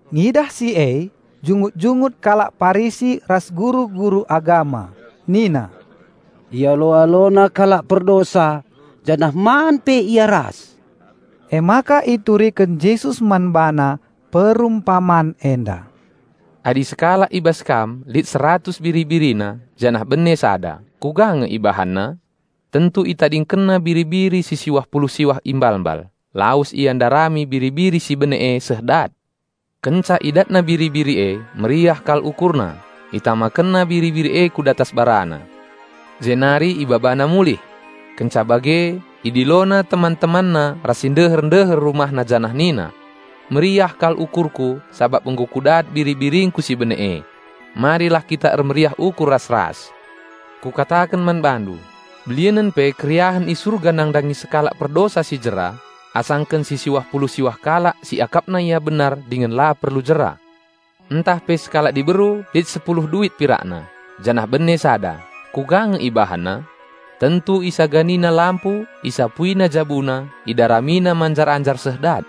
Ngidah si e jungut-jungut kalak Parisi ras guru-guru agama nina, "Ialo-AloNa kalak perdosa janah man pe Ia ras." Emaka ituriken Jesus man bana perumpaman enda, "Adi sekalak i bas kam lit seratus biri-birina janah bene sada kuga nge ibahanna? Tentu itadingkenna biri-biri si siwah pulu siwah i mbalmbal, lawes ia ndarami biri-biri si bene e seh dat. Kenca idatna biri-biri e, meriah kal ukurna, itamakenna biri-biri e ku datas barana, jenari ibabana mulih. Kenca bage, idilona teman-temanna ras si ndeher-ndeher rumahna janah nina, 'Meriah kal ukurku sabap nggo ku dat biri-biringku si bene e. Marilah kita ermeriah ukur ras-ras.' Kukataken man bandu: Belinen pe keriahen i Surga nandangi sekalak perdosa si jera asangken si siwah pulu siwah kalak si akapna ia benar dingen la perlu jera." "Ntah pe sekalak diberu lit sepuluh duit pirakna, janah bene sada kuga nge ibahanna? Tentu isaganina lampu isapuina jabuna, idaramina manjar-anjar seh dat.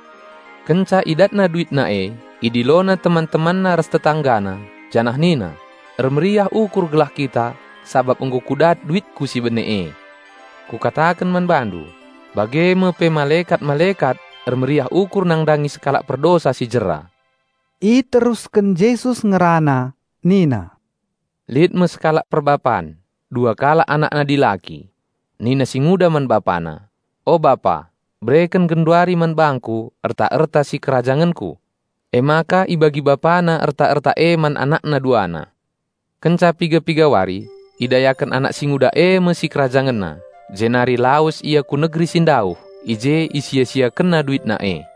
Kenca idatna duitna e, idilona teman-temanna ras tetanggana, janah nina, 'Ermeriah ukur gelah kita, sabap nggo ku dat duitku si bene e!' Kukataken man bandu, bage me pe malekat-malekat ermeriah ukur nandangi sekalak perdosa si jera." Iterusken Jesus ngerana nina, "Lit me sekalak perbapan, dua kalak anakna dilaki. Nina si nguda man bapana, 'O bapa, bereken genduari man bangku erta-erta sikerajangenku.' Emaka ibagi bapana erta-erta e man anakna duana. Kenca piga-piga wari, idayaken anak si nguda e me sikerajangenna, jenari lawes ia ku negeri si ndauh. I je isia-siakenna duitna e.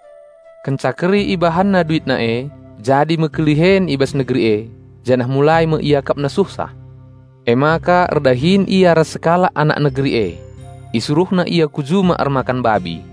Kenca keri ibahanna duitna e, jadi me kelihen i bas negeri e, janah mulai me iakapna suhsah. Emaka erdahin ia ras sekalak anak negeri e. Isuruhna ia ku juma ermakan babi.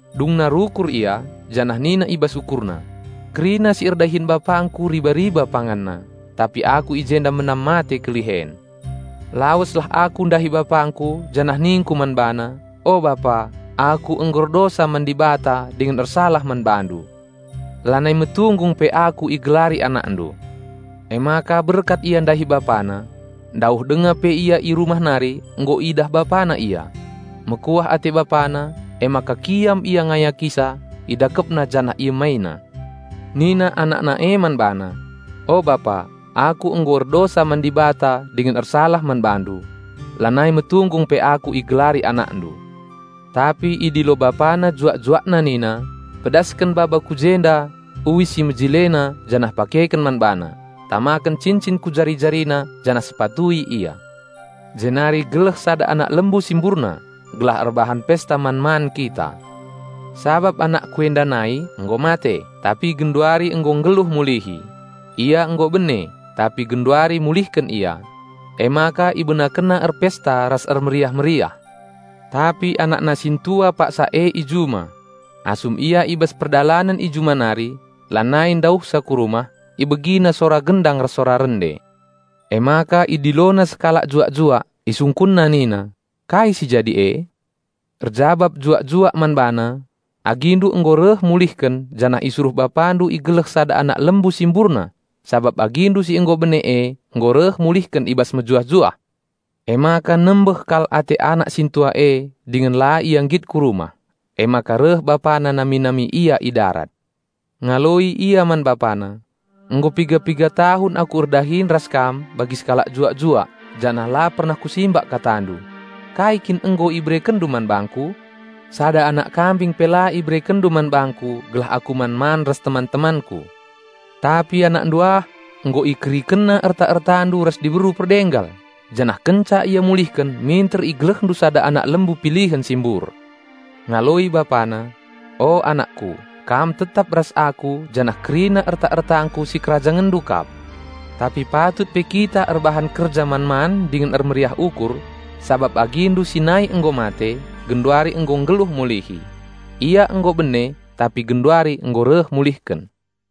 Dungna rukur ia, janah nina i bas ukurna, 'Kerina si erdahin bapangku riba-iba panganna, tapi aku i jenda menam mate kelihen. Laweslah aku ndahi bapangku janah ningku man bana, O bapa, aku nggo erdosa man Dibata dingen ersalah man bandu. Lanai metunggung pe aku igelari anakndu.' Emaka berkat ia ndahi bapana. Ndauh denga pe ia i rumah nari nggo idah bapana ia. Mekuah ate bapana, emaka kiam ia ngayakisa, idakepna janah iemaina. Nina anakna e man bana, 'O bapa, aku nggo erdosa man Dibata dingen ersalah man bandu. Lanai metunggung pe aku igelari anakndu.' Tapi idilo bapana juak-juakna nina, 'Pedasken baba ku jenda uis si mejilena janah pakeken man bana! Tamaken cincin ku jari-jarina janah sepatui ia. Jenari geleh sada anak lembu si mburna, gelah erbahan pesta man-man kita. Sabap anakku enda nai nggo mate, tapi genduari nggo nggeluh mulihi; ia nggo bene, tapi genduari mulihken ia.' Emaka ibenakenna erpesta ras ermeriah-meriah. Tapi anakna sintua paksa e i juma. Asum ia i bas perdalanen i juma nari, lanai ndauhsa ku rumah, ibegina sora gendang ras sora rende. Emaka idilona sekalak juak-juak, isungkunna nina, 'Kai si jadi e?' Erjabap juak-juak man bana, 'Agindu nggo reh mulihken janah isuruh bapandu igeleh sada anak lembu si mburna, sabap agindu si nggo bene e nggo reh mulihken i bas mejuah-juah.' Emaka nembeh kal ate anak sintua e dingen la ia nggit ku rumah. Emaka reh bapana nami-nami ia i darat. Ngaloi ia man bapana, 'Nggo piga-piga tahun aku erdahin ras kam bagi sekalak juak-juak janah la pernah kusimbak katandu. Kai kin nggo iberekenndu man bangku? Sada anak kambing pe la iberekenndu man bangku gelah aku man-man ras teman-temanku. Tapi anakndu ah, nggo ikerikenna erta-ertandu ras diberu perdenggal, janah kenca ia mulihken minter igelehndu sada anak lembu pilihen si mbur!' Ngaloi bapana, 'O anakku, kam tetap ras aku janah kerina erta-ertangku sikerajangenndu kap. Tapi patut pe kita erbahan kerja man-man dingen ermeriah ukur, sabap agindu si nai nggo mate, genduari nggo nggeluh mulihi; ia nggo bene, tapi genduari nggo reh mulihken.'"